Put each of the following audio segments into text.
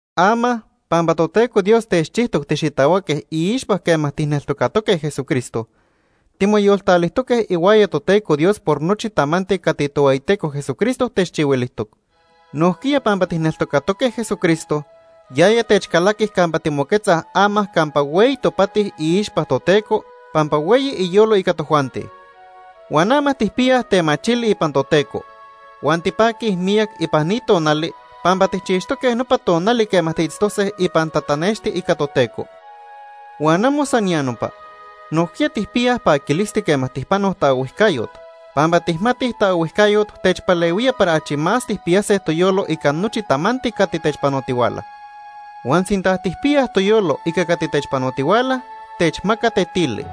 Ama, pampa Toteco Dios techchijtoc tixitahuaque iixpa quema tijneltocatoque Jesucristo, timoyoltalijtoque ihuaya Toteco Dios por nochi tamanti cati Tohueyiteco Jesucristo techchihuilijtoc. Nojquiya pampa tijneltocatoque Jesucristo, yaya techcalaqui campa timoquetzaj ama campa hueyi topati iixpa Toteco pampa hueyi iyolo ica tojuanti. Huan ama tijpiyaj temachili ipan Toteco. Huan tipaquij miyac ipan ni tonali pampa tijchixtoque nopa tonali quema tiitztose ipan tatanexti ica Toteco. Huan amo san ya nopa, nojquiya tijpiyaj paquilisti quema tijpanoj taohuijcayot, pampa tijmatij taohuijcayot techpalehuía para achi más tijpiyase toyolo ica nochi tamanti cati techpanotihuala. Huan sinta tijpiyaj toyolo ica cati techpanotihuala, techmaca tetili.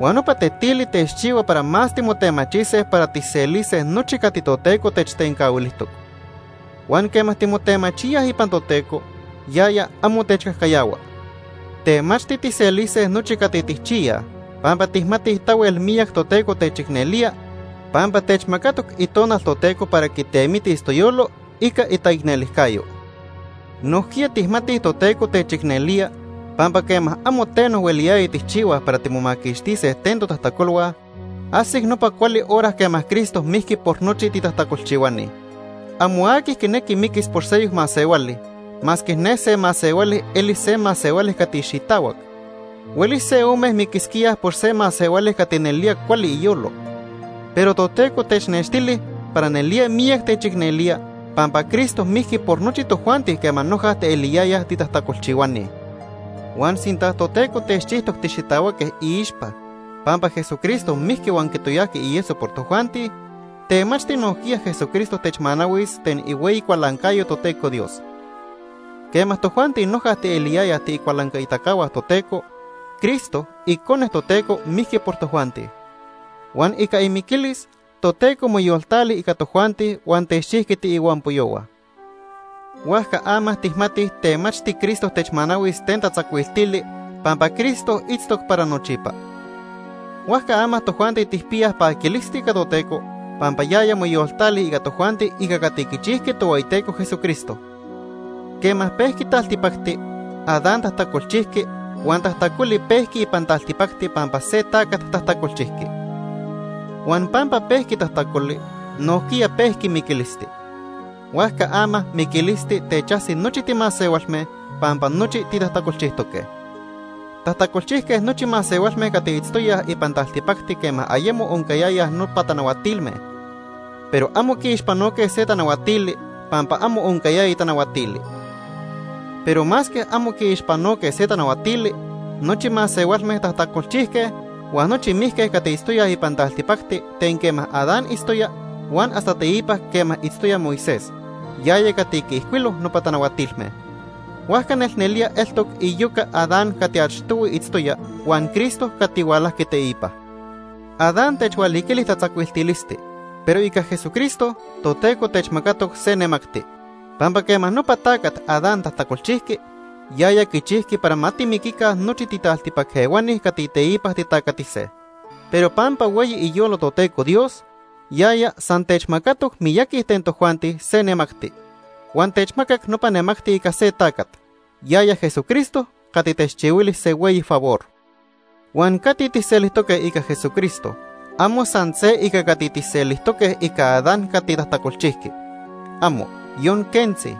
Huan nopa tetili techchihua para más timotemachise para tijselise nochi cati Toteco techtencahuilijtoc. Huan quema timotemachíaj ipan Toteco, yaya amo techcajcayahua. Temachti tijselise nochi cati tijchiyaj pampa tijmatij tahuel miyac Toteco techicnelía pampa techmacatoc Itonal Toteco para quitemitis toyolo ica itaicnelijcayo. Nojquiya tijmatij Toteco techicnelía pampa quema amo teno hueliyaya tijchihuaj para timomaquixtise ten totajtacolhua, ajsic nopa cuali hora quema Cristo mijqui por nochi titajtacolchihuani. Amo aqui quinequi miquis por seyoc masehuali masque ne se masehuali eli se masehuali cati xitahuac. Huelis se ome miquisquíaj por se masehuali cati nelía cuali iyolo. Pero Toteco technextili para nelía miyac techicnelía pampa Cristo mijqui por nochi tojuanti quema noja tieliyayaj titajtacolchihuani. Huan sinta Toteco techchijtoc tixitahuaque iixpa pampa Jesucristo mijqui huan quitoyajqui ieso por tojuanti, temachti nojquiya Jesucristo techmanahuis ten ihueyi cualancayo Toteco Dios. Quema tojuanti noja tieliyayaj tiicualancaitacahua Toteco, Cristo icone Toteco mijqui por tojuanti. Huan ica imiquilis, Toteco moyoltali ica tojuanti huan techchijqui tiihuampoyohua. Huajca ama tijmatij temachti Cristo techmanahuis ten tatzacuiltili pampa Cristo itztoc para nochipa. Huajca ama tojuanti tijpiyaj paquilisti ica Toteco pampa yaya moyoltali ica tojuanti ica cati quichijqui Tohueyiteco Jesucristo. Quema pejqui taltipacti, Adán tajtacolchijqui huan tajtacoli pejqui ipan taltipacti pampa se tacat tajtacolchijqui. Huan pampa pejqui tajtacoli, nojquiya pejqui miquilisti. Huajca ama miquilisti techajsi nochi timasehualme, pampa nochi titajtacolchijtoque. Tajtacolchijque nochi masehualme cati itztoyaj ipan taltipacti quema ayemo oncayayaj nopa tanahuatilme, pero amo quiixpanoque se tanahuatili pampa amo oncayaya tanahuatili. Pero masque amo quiixpanoque se tanahuatili, nochi masehualme tajtacolchijque huan nochi mijque cati itztoyaj ipan taltipacti ten quema Adán itztoya huan hasta teipa quema itztoya Moisés, yaya cati quiijcuilo nopa tanahuatilme. Huajca nelnelía eltoc iyoca Adán cati achtohui itztoya huan Cristo cati hualajqui teipa. Adán techhualiquili tatzacuiltilisti, pero ica Jesucristo, Toteco techmacatoc se nemacti. Pampa quema nopa tacat Adán tajtacolchijqui, yaya quichijqui para ma timiquica nochi titaltipac ehuani cati teipa titacatise. Pero pampa hueyi iyolo Toteco Dios, yaya san techmacatoc miyaqui ten tojuanti se nemacti. Huan techmacac nopa nemacti ica se tacat, yaya Jesucristo cati techchihuili se hueyi favor. Huan cati tijselijtoque ica Jesucristo amo san se ica cati tijselijtoque ica Adán cati tajtacolchijqui. ¡Amo, yon quentzi!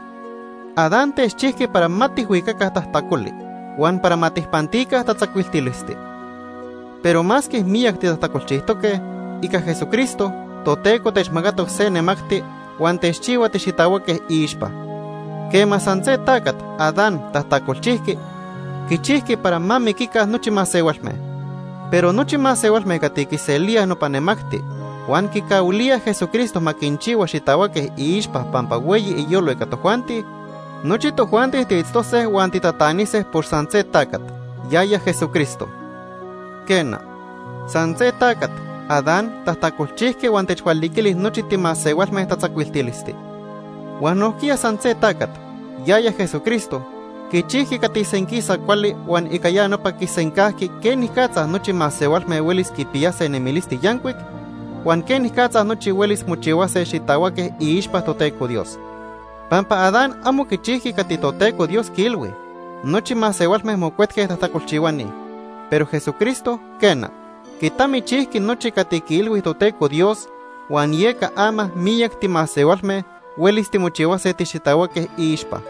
Adán techchijqui para ma tijhuicaca tajtacoli, huan para ma tijpantica tatzacuiltilisti. Pero masque miyac titajtacolchijtoque, ica Jesucristo Toteco techmacatoc se nemacti huan techchihua tixitahuaque iixpa. Quema san se tacat, Adán, tajtacolchijqui, quichijqui para ma miquica nochi masehualme. Pero nochi masehualme cati quiselíaj nopa nemacti huan quicahuilíaj Jesucristo ma quinchihua xitahuaque iixpa pampa hueyi iyolo ica tojuanti, nochi tojuanti tiitztose huan titatanise por san se tacat, yaya Jesucristo. Quena, san se tacat, Adán, tajtacolchijqui huan techhualiquili nochi timasehualme tatzacuiltilisti. Huan nojquiya san se tacat, yaya Jesucristo, quichijqui cati senquisa cuali huan ica ya nopa quisencajqui quenicatza nochi masehualme huelis quipiyase nemilisti yancuic, huan quenicatza nochi huelis mochihuase xitahuaque iixpa Toteco Dios. Pampa Adán amo quichijqui cati Toteco Dios quiilhui, nochi masehualme mocuetque tajtacolchihuani, pero Jesucristo quena, quitamichijqui nochi cati quiilhui Toteco Dios, huan yeca ama miyac timasehualme huelis timochihuase tixitahuaque iixpa.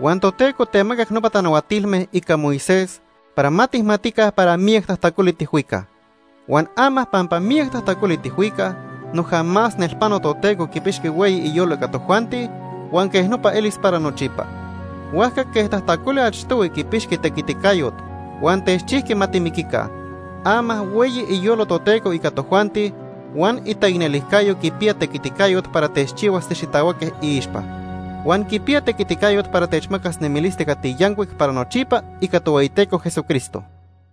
Huan Toteco temacac nopa tanahuatilme ica Moisés para ma tijmatica para miyac tajtacoli tijhuicaj. Huan ama pampa miyac tajtacoli tijhuicaj, noja más nelpano Toteco quipixqui hueyi iyolo ica tojuanti, huan quej nopa elis para nochipa. Huajca quej tajtacoli achtohui quipixqui tequiticayot huan techchijqui ma timiquica, ama hueyi iyolo Toteco ica tojuanti huan itaicnelijcayo quipiya tequiticayot para techchihuas tixitahuaque iixpa. Huan quipiya tequiticayot para techmacas nemilisti cati yancuic para nochipa ica Tohueyiteco Jesucristo.